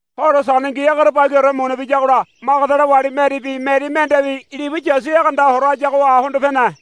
Horo Sandengi egerebagiore muna biyagola Magadala wali Meribi Meri mendebi libu Yasu egeanda horo hayagoha hondo pene.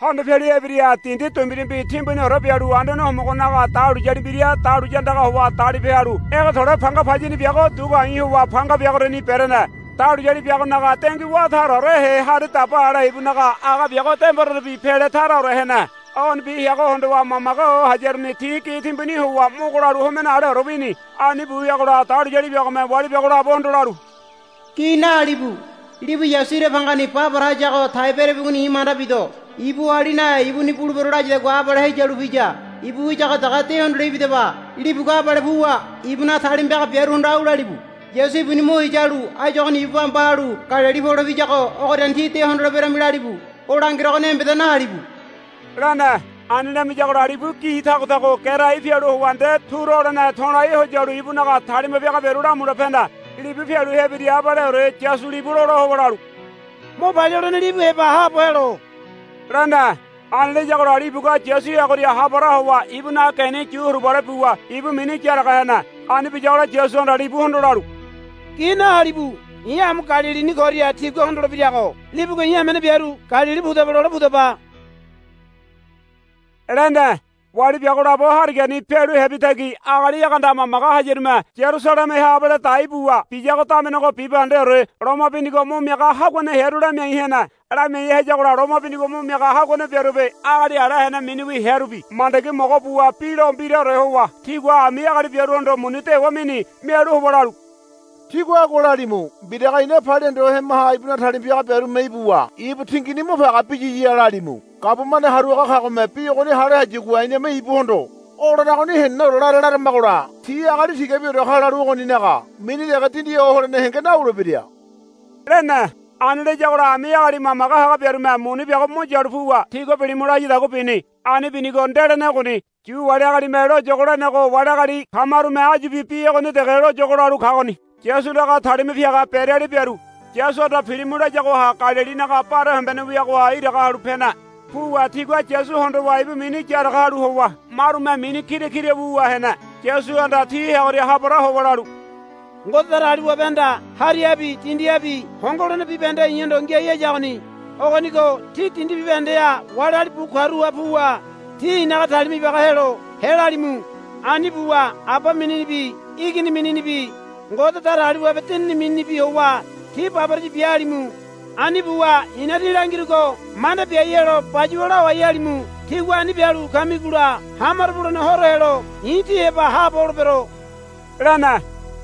Hondo pialu hebira dindi dumbirumbi timbuniore bialu Anduane Homogonaga dahuliyali mbira dahuliya andaga howa dalipe halu ege to̱le̱ panga payini biago dugu a̱i̱ howa panga biagoriani berene. Dahuliyali biagonaga dengui wá taraorehe hari daba ale ibunaga aga biago demborerebi pele taraore hene. Ogonibi heago hondowa mamage ho hayaruni ti gi timbuni howa mogo lalu homene aleore wini. Ani bu wiagola dahuliyali biagome wali biago labohondo lalu, Gi nahalibu. Libu Yasu ira bangani ba para hayago tai berabigoni i̱ manda bido. Ibu oali nahe ibuni bulebero layadagua abale heyalu piya. Ibu wiyago dege de hondole ibidaba. Libugua abale puwa ibunaga talima piaga biaruhondo au lalibu. Yasu ibuni mo heya halu áyu ogoni ibu bamba halu Galili pole piyago ogoriani tí de hondoleberami lalibu. O langerogoni embeda nahalibu, lene. Ani lamiyagola libu gi tago tago gerai pialu howa nde turu holene to̱lai ho yalu ibunaga talima piaga biaru lamule pene. Libu pialu hebira abaleore Yasu libu lola howa lalu, Mo palia holene libu heba haabo helo, lene. Ani layagola libugua Yasu heagoria ha para howa ibunaga geni yu huribale buwa ibu mini yaraga hene. Ani biyagola Yasuhanda libuhondo lalu, Gi nahalibu. I̱ amu Galilini koria tigua hondolebirago libugua i̱ hamene biaru Galili pudaba lole pudaba, lene. Wali biago labo harigani pialu hebi tagi agali egeanda mamage hayarume Yarusalemeha abale dai buwa biyago damenego bibahendeore loma binigo mo miaga haguane hearu lamiai hene. Lamiai hayagola loma binigo mo miaga haguane biarubi agali ala hene miniwi hearubi mandagi mogo buwa bi lo mbiraore howa tigua ami agali biaruhondo muni dewa mini. Mialu howa lalu, Tígua agua lalimu. Mbiraga ina palia hondo hemaha ibunaga talima piaga biarume ibuwa ibu tingini mo page biyiya, lalimu. Gabumane haru haga kagome bi ogoni hale hayagua iname ibuhondo, O laragoni heneneore lara, laramagola tí agali tigabiore ka lalu ogoninaga mini dege dindi ho holene henge nawulebira, lene. Ani layagola ami agali mamage haga biarume muni biago mo yalu puwa tigua bilimu layadagua bini. Ani binigo ndelene ogoni. Yu wali agalime loyogo lenego wali agali kamarume áyubi bi ogoni dege loyogo lalu kagoni. Yasunaga talima piaga beriali biaru Yasuhanda pilimu layagoha Galilinaga bare hombene wiagoha iraga halu pene. Puwa tigua Yasu hondowa ibu mini yaraga halu howa marume mini kira kira wuwa hene. Yasuhanda ti heagoria ha para howa lalu, Ngode Datagaliwabehanda harihabi dindihabi hongo holene bibahende i̱hondo ngiai hayagoni. Ogonigo tí dindi bibahendeha wali agali bu karuha puwa ti i̱naga talima ibaga helo helalimu. Ani buwa Aba mininibi Igini mininibi Ngode Datagaliwabe Dinini mininibi howa ti baboraya bia halimu. Ani buwa i̱na tí langirugo manda biai helo bayuwa lawai halimu. Tígua ani bialu kamigola hamaro bulene horo helo i̱ tí heba haabo holebero, lene.